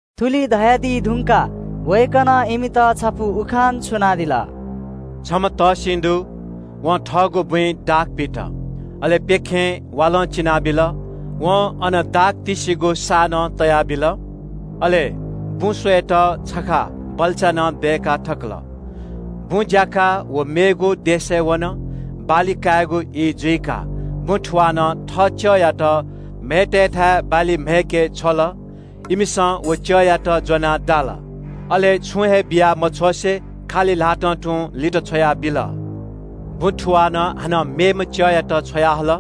थुलि धयादी धुंकाः वय्‌कलं इमित छपु उखान छुनादिल। “छम्‍ह तःसिं दु। वं थःगु क्‍यबय् दाख पित। अले प्‍यखें वालं चिनाबिल। वं अन दाख तिस्‍सिगु साः नं तयाबिल। अले क्‍यब स्‍वयेत छखा बल्‍चा नं दय्‌का थकल। क्‍यबय् ज्‍याकाः व मेगु देशय् वन। बाली कायेगु ई जुइकाः दाखक्‍यबया थुवालं थः च्‍यःयात म्‍हय्‌तय्‌थाय् बाली काय्‌के छ्वल। इमिसं व च्‍यःयात ज्‍वनाः दाल, अले छुं हे बिया मछ्वसें खालि ल्‍हातं तुं लित छ्वयाबिल। दाखक्‍यबया थुवालं हानं मेम्‍ह च्‍यःयात छ्वयाहल।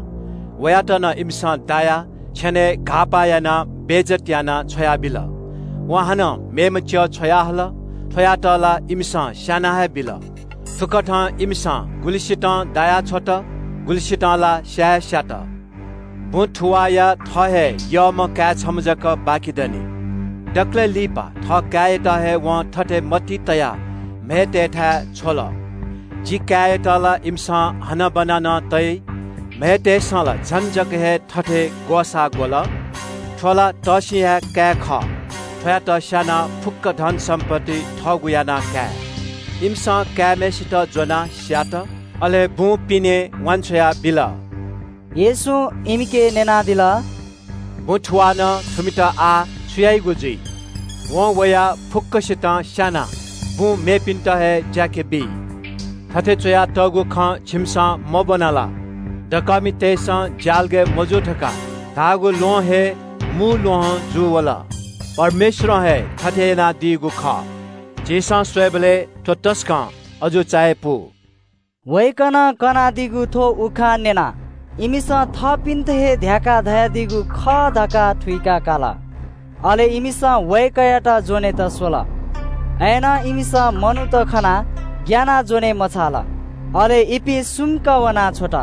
वयात नं इमिसं दायाः छेनय् घाःपाः यानाः बेइज्‍जत यानाः छ्वयाबिल। वं हानं मेम्‍ह च्‍यः छ्वयाहल, थ्‍वयात ला इमिसं स्‍याना हे बिल। थुकथं इमिसं गुलिसितं दायाछ्वत, गुलिसितं ला स्‍या हेस्‍यात। दाखक्‍यबया थुवाःया थः हे यःम्‍ह काय् छम्‍ह जक बाकि दनि। दकलय् लिपा थःकाय्‌यात हे वं थथे मतिइ तयाः म्‍हय्‌तय्‌थाय् छ्वल – ‘जि काय्‌यात ला इमिसं हनाबना हे तइ।’ “म्‍हय्‌तय्‌सं ला झन जक हे थथे ग्‍वसाः ग्‍वल – ‘थ्‍व ला तःसिंया हे काय् खः, थ्‍वयात स्‍यानाः फुक्‍क धनसम्‍पत्ति थःगु याना काये।’ इमिसं काय्‌म्‍हय्‌सित ज्‍वनाः स्‍यात, अले बुं पिने वान्‍छ्वया बिल।” येशूं इमिके न्‍यनादिल – “दाखक्‍यबया थुवालं थुमित आः छु याइगु जुइ? वं वयाः फुक्‍कसितं स्‍यानाः क्‍यब मेपिन्‍त हे ज्‍याके बी। थथे च्‍वयातःगु खँ छिमिसं मब्‍वना ला? “‘दकःमितय्‌सं ज्‍यालगय् मजूगु धकाः धाःगु ल्‍वहं हे मू ल्‍वहं जूवल। परमेश्‍वरं हे थथे यानादीगु खः। झीसं स्‍वयेबलय् थ्‍व तसकं अजू चायापु!’” वय्‌कलं कनादीगु थ्‍व उखान न्‍यनाः इमिसं थःपिन्‍त हे ध्‍याकाः धयादीगु खः धकाः थुइका काल। अले इमिसं वय्‌कःयात ज्‍वनेत स्‍वल। अय्‌नं इमिसं मनूत खनाः ग्‍यानाः ज्‍वने मछाल, अले इपिं सुम्‍क वनाछ्वत।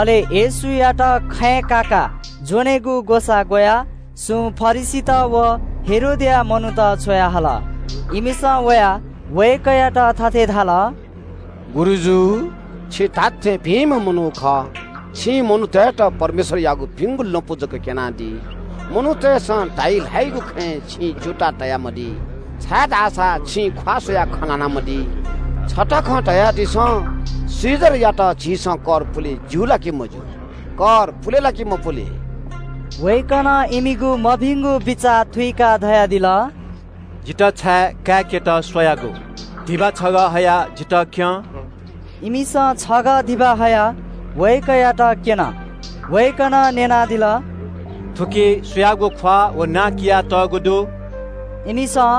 अले इमिसं येशूयात खँय् काकाः ज्‍वनेगु ग्‍वसाः ग्‍वयाः सुं फरिसीत व हेरोदया मनूत छ्वयाहल। इमिसं वयाः वय्‌कःयात थथे धाल – “गुरुजु, छि धात्‍थें भिंम्‍ह मनू खः। छिं मनूतय्‌त परमेश्‍वरयागु भिंगु लँपु जक क्‍यनादी। मनूतय्‌सं धाइ ल्‍हाइगु खँय् छिं च्‍यूताः तयामदी, छाय्‌धाःसा छिं ख्‍वाः स्‍वयाः खँ ल्‍हानामदी। छता खँ धयादिसँ, कैसरयात झीसं कर पुले ज्‍यू ला कि मज्‍यू? कर पुले ला कि मपुले?” वय्‌कलं इमिगु मभिंगु बिचाः थुइकाः धयादिल – “जितः छाय् काय्‌केत स्‍वयागु? धिबा छगः हयाः जितः क्‍यँ।” इमिसं छगः धिबा हयाः वय्‌कःयात क्‍यन। वय्‌कलं न्‍यनादिल – “थुकी सुयागु ख्‍वाः व नां कियातःगु दु?” इमिसं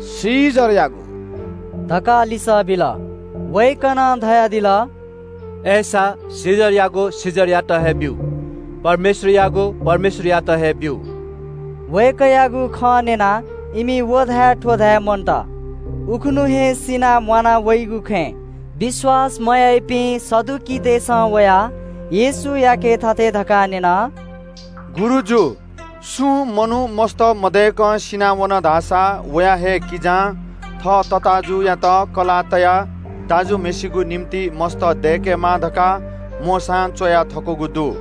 “कैसरयागु” धकाः लिसः बिल। वय्‌कलं धयादिल – “अय्‌सा, कैसरयागु कैसरयात हे ब्‍यु, परमेश्‍वरयागु परमेश्‍वरयात हे ब्‍यु।” वय्‌कःयागु खँ न्‍यनाः इमि व धाये थ्‍व धाये मन्‍त। उखुन्‍हु हे सिनाः म्‍वाना वइगु खँय् विश्‍वास मयाइपिं सदुकीतय्‌सं वयाः येशूयाके थथे धकाः न्‍यन – “गुरुजु, सुं मनू मस्‍त मदय्‌कं सिनावन धाःसा वया हे किजां थः तताःजुयात कलाः तयाः दाजुम्‍हय्‌सिगु निंतिं मस्‍त दय्‌केमाः धकाः मोशां च्‍वया थकूगु दु।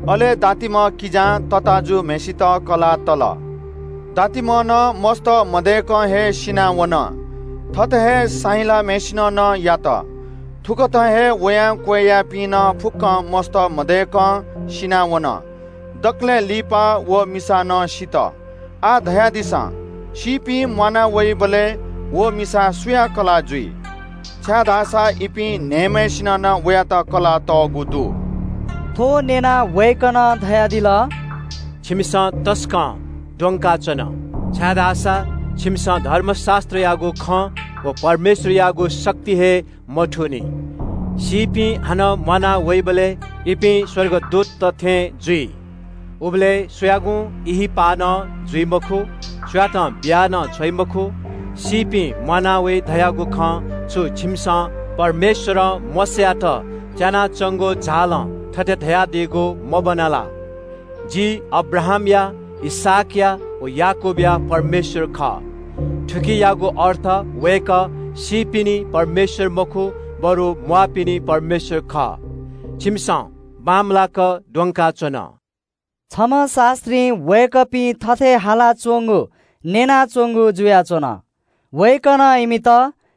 अले दातिम्‍ह किजां तताःजुम्‍हय्‌सित कलाः तल। दातिम्‍ह नं मस्‍त मदय्‌कं हे सिनावन। थथे हे साहिलाम्‍हय्‌सिनं नं यात। थुकथं हे वयां क्‍वय्‌यापिं नं फुक्‍कं मस्‍त मदय्‌कं सिनावन। दकलय् लिपा व मिसा नं सित। आः धयादिसँ, सीपिं म्‍वाना वइबलय् व मिसा सुया कलाः जुइ, छाय्‌धाःसा इपिं न्‍हय्‌म्‍हय्‌सिनं नं वयात कलाः तःगु दु।” थ्‍व न्‍यनाः वय्‌कलं धयादिल – “छिमिसं तसकं द्वंकाच्‍वन, छाय्‌धाःसा छिमिसं धर्मशास्‍त्रयागु खँ व परमेश्‍वरयागु शक्ति हे मथूनि। सीपिं हानं म्‍वाना वइबलय् इपिं स्‍वर्गदूतत थें जुइ। उबलय् सुयागुं ब्‍याहा नं जुइ मखु, सुयातं बिया नं छ्वइ मखु। “सीपिं म्‍वाना वइ धयागु खँ छु छिमिसं परमेश्‍वरं मोशायात च्‍यानाच्‍वंगु झालं थथे धयादीगु मब्‍वना ला? – ‘जि अब्राहामया, इसहाकया व याकूबया परमेश्‍वर खः।’ थुकियागु अर्थ वय्‌कः सीपिनि परमेश्‍वर मखु, बरु म्‍वाःपिनि परमेश्‍वर खः। छिमिसं तसकं द्वंकाच्‍वन।” छम्‍ह शास्‍त्रीं वय्‌कःपिं अथे हालाच्‍वंगु न्‍यनाच्‍वंगु जुयाच्‍वन। वय्‌कलं इमित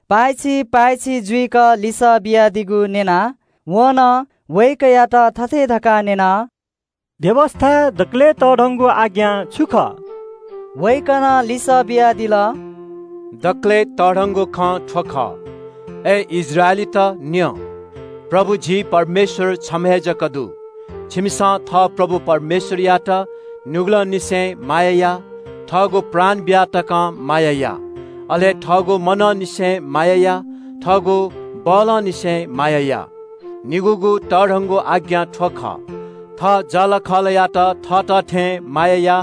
पाय्‌छि पाय्‌छि जुइक लिसः बियादीगु न्‍यनाः वं नं वय्‌कःयात थथे धकाः न्‍यन – “व्‍यवस्‍थाय् दकलय् तःधंगु आज्ञा छु खः?” वय्‌कलं लिसः बियादिल – “दकलय् तःधंगु खँ थ्‍व खः – ‘हे इस्राएलीत न्‍यँ! परमप्रभु झी परमेश्‍वर छम्‍ह हे जक दु। छिमिसं परमप्रभु झी परमेश्‍वरयात दुनुगलंनिसें माया या, थःगु प्राण बिया तकं माया या, थःगु मनंनिसें माया या, अले थःगु बलं फतले माया या।’ निगूगु तःधंगु आज्ञा थ्‍व खः – ‘थः जःलाखःलायात थःत थें माया या।’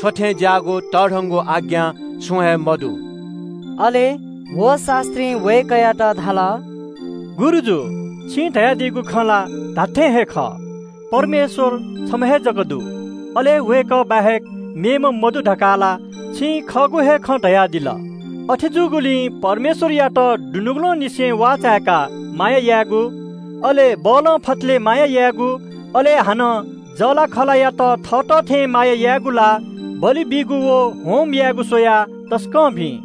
थ्‍व थें ज्‍याःगु तःधंगु आज्ञा छुं हे मदु।” अले व शास्‍त्रीं वय्‌कःयात धाल – “गुरुजु, छिं धयादीगु खँ ला धात्‍थें हे खः। परमेश्‍वर छम्‍ह हे जक दु। अले वय्‌कः बाहेक मेम्‍ह मदु धकाः ला छिं खःगु हे खँ धयादिल। अथे जूगुलिं परमेश्‍वरयात दुनुगलंनिसें वाःचाय्‌काः माया यायेगु, अले बलं फतलय् माया यायेगु, अले हानं जःलाखःलायात थःत थें माया यायेगु ला बलि बीगु व होमबलि स्‍वयाः तसकं भिं।”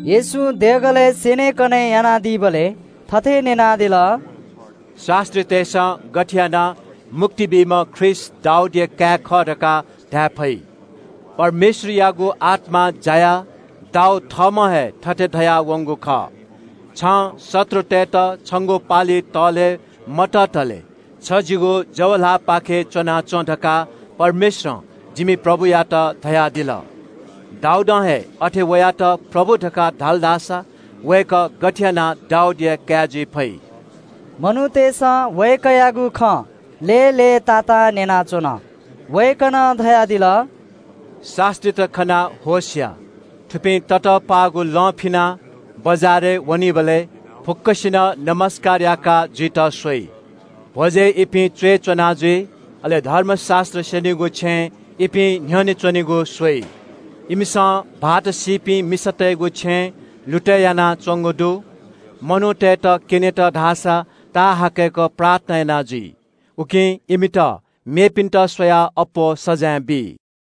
येशूं देगलय् स्‍यनेकने यानादीबलय् थथे न्‍यनादिल – “शास्‍त्रीतय्‌सं गथे यानाः मुक्ति बीम्‍ह ख्रीष्‍ट दाऊदया काय् खः धकाः धाये फइ? पवित्र आत्‍मां जायाः दाऊद थःम्‍हं हे थथे धयावंगु खः – “‘छं शत्रुतय्‌त छंगु पालि तःले मततले छ जिगु जवय् च्‍वनाच्‍वँ धकाः परमप्रभुं जिमि प्रभुयात धयादिल।’ “दाऊदं हे अथे वयात ‘प्रभु’ धकाः धाल धाःसा वय्‌कः गथे यानाः दाऊदया काय् जुइ फइ?” ग्‍वाः ग्‍वाः मनूतय्‌सं वय्‌कःयागु खँ लय्‌लय्‌तातां न्‍यनाच्‍वन। वय्‌कलं धयादिल – “शास्‍त्रीत खनाः होश या। थुपिं ततःपाःगु लं फिनाः बजारय् वनीबलय् फुक्‍कसिनं मानय् याका जुइत स्‍वइ। भ्‍वजय् इपिं च्‍वय् च्‍वना जुइ, अले धर्मशास्‍त्र स्‍यनीगु छेँय् इपिं न्‍ह्यःने च्‍वनेगु स्‍वइ। इमिसं भाःत मदुपिं मिसातय्‌गु छेँ लुतय् यानाच्‍वंगु दु। मनूतय्‌त क्‍यनेत धाःसा ताःहाकय्‌क प्रार्थना याना जुइ। उकिं इमित मेपिन्‍त स्‍वयाः अप्‍वः सजाँय बी।”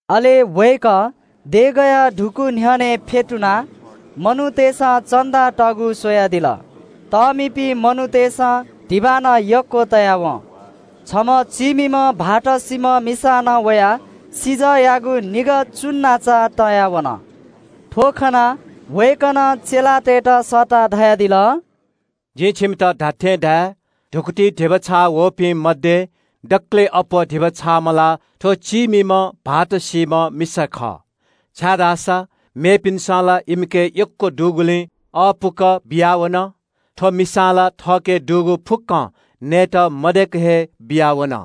अले वय्‌कः देगःया धुकू न्‍ह्यःने फ्‍यतुनाः मनूतय्‌सं चन्‍दा तःगु स्‍वयादिल। तःमिपिं मनूतय्‌सं धिबा नं यक्‍व तया वं। छम्‍ह चीमिम्‍ह विधवा मिसां नं वयाः सिजःयागु निगः चुन्‍नाचा तया वन। थ्‍व खनाः वय्‌कलं चेलातय्‌त सःताः धयादिल – “जिं छिमित धात्‍थें धाये – धुकुतिइ धिबा छाःवःपिं मध्‍ये दकलय् अप्‍वः धिबा छाःम्‍ह ला थ्‍व चीमिम्‍ह विधवा मिसा खः। छाय्‌धाःसा मेपिन्‍सं ला इमिके यक्‍व दुगुलिं अःपुक बियावन। थ्‍व मिसां ला थःके दुगु फुक्‍कं नयेत मदय्‌क हे बियावन।”